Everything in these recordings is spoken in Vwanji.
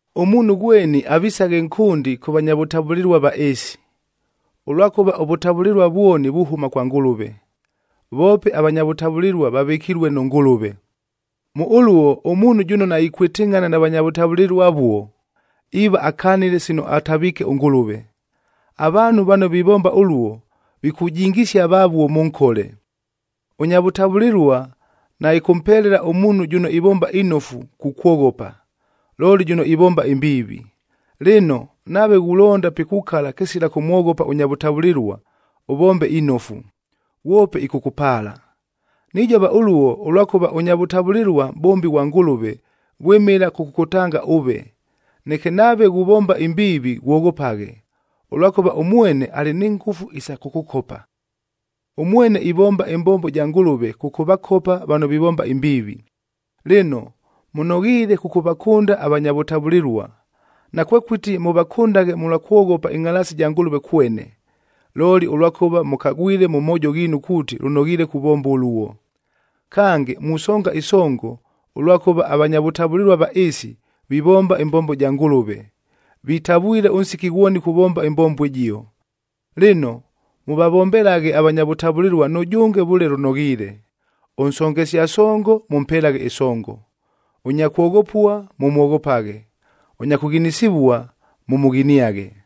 Ʉmuunhu ghweni avisaghe nkʉndi kʉ vanya vʉtavʉlɨlua va ɨɨsi, ʉlwakʉva ʉvʉtavʉlɨlua vwoni vuhʉma kwa Ngʉlʉve, voope avanya vʉtavʉlɨlua vavɨkilue nʉ Ngʉlʉve. Mʉ ʉluo ʉmuunhu jʉno naikwɨtɨngʼhana na vanya vʉtavʉlɨlua avuo, iiva akanile sino ataviike ʉNgʉlʉve. Avaanhu vano vivomba ʉluo, vikujingisia vavuo mʉ nkole. Ʉnya vʉtavʉlɨlua naɨkʉmpelela ʉmuunhu jʉno ivomba inofu kukwoghopa, looli jʉno ivomba imbiivi. Lɨno, nave ghulonda pikukala kɨsila kʉmwoghopa ʉnya vʉtavʉlɨlua, ʉvombe inofu, ghwope ɨkʉkʉpaala. Nijova ʉluo ʉlwakʉva ʉnya vʉtavʉlɨlua mʼbombi ghwa Ngʉlʉve vwɨmɨla kʉkʉkʉtanga ʉve. Neke nave ghuvomba imbiivi ghwoghopaghe, ʉlwakʉva ʉmwene alɨ ni ngʉfu isa kʉkʉkopa. Ʉmwene ivomba ɨmbombo ja Ngʉlʉve kʉkʉvakopa vano vivomba imbiivi. Lɨno, mʉnoghiile kʉkʉvakʉnda avanya vʉtavʉlɨlua, nakwekʉti mʉvakʉndaghe mʉlwa kwoghopa ɨngʼhalaasi ja Ngʉlʉve kwene, looli ʉlwakʉva mʉkagwile mʉ moojo ghiinu kuuti lʉnoghiile kuvomba ʉluo. Kange, musonga ɨsongo, ʉlwakʉva avanya vʉtavʉlɨlua va ɨɨsi vivomba ɨmbombo ja Ngʉlʉve, vitavwile ʉnsiki ghwoni kuvomba ɨmbombo ɨjio. Lɨno, mʉvavombelaghe avanya vʉtavʉlɨlua nʉjʉnge vʉle lʉnoghiile. Ʉnsongesia songo, mʉmpelaghe ɨsongo; ʉnya kwoghopua, mʉmwoghopaghe; ʉnya kʉghinisivua, mʉmʉghiniaghe.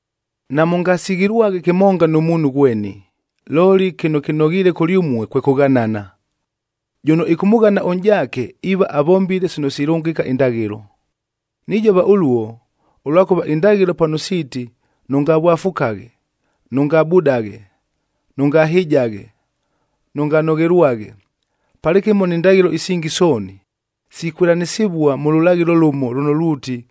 Namʉngasighilwaghe kɨmonga nʉ muunhu ghweni, looli kɨno kɨnoghiile kʉlyʉmue kwe kʉghanana. Jʉno ɨkʉmʉghana ʉnʼjaake iiva avombile sino silʉngɨka indaghɨlo. Nijova ʉluo, ʉlwakʉva indaghɨlo pano siiti, “Nʉngavwafukaghe, nʉngabudaghe, nʉngahɨjaghe, nʉnganoghelwaghe,” palɨkɨmo ni ndaghɨlo isingi sooni, sikwɨlanɨsɨvua mʉ lʉlaghɨlo lʉmo lʉno luuti,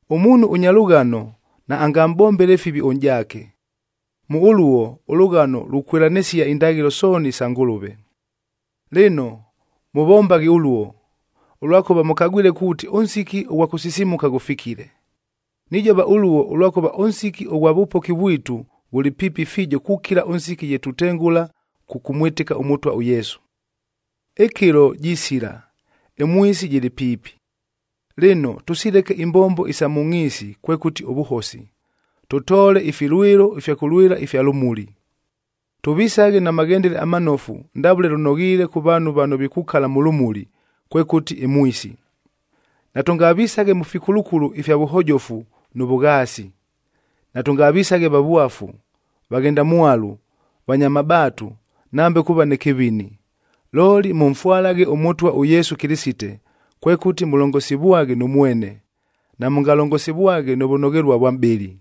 Ʉmuunhu ʉnya lʉghano naangamʼbombele fivi ʉnʼjaake. Mʉ ʉluo ʉlʉghano lukwɨlanɨsia indaghɨlo sooni isa Ngʉlʉve. Lɨno mʉvombaghe ʉluo, ʉlwakʉva mʉkagwile kuuti ʉnsiki ʉghwa kʉsisimuka ghʉfikile. Nijova ʉluo ʉlwakʉva ʉnsiki ʉghwa vʉpoki vwitu ghʉlɨ piipi fiijo kukila ʉnsiki ye tutengʉla kʉkʉmwɨtɨka ʉMʉtwa ʉYesu. Ɨkɨlo jisila, ɨmwisi jɨlɨ piipi. Lɨno, tʉsileke imbombo isa mʉ ngʼhiisi kwekʉti ʉvʉhosi, tʉtoole ifilwɨlo ifya kʉlwɨla ifya lʉmuli. Tʉvisaghe na maghendele amanofu ndavʉle lʉnoghiile kʉ vaanhu vano vikukala mʉ lʉmuli, kwekʉti ɨmwisi. Natʉngavisaghe mʉ fikulukulu ifya vʉhojofu nʉ vʉghaasi. Natʉngavisaghe vavwafu, vaghendamwalu, vanya mabaatu, nambe kuuva nɨ kɨvini. Looli mʉmfwalaghe ʉMʉtwa ʉYesu Kɨlɨsite, kwekʉti mʉlongosivwaghe nʉ mwene, namʉngalongosivwaghe nʉ vʉnoghelua vwa mʼbɨlɨ.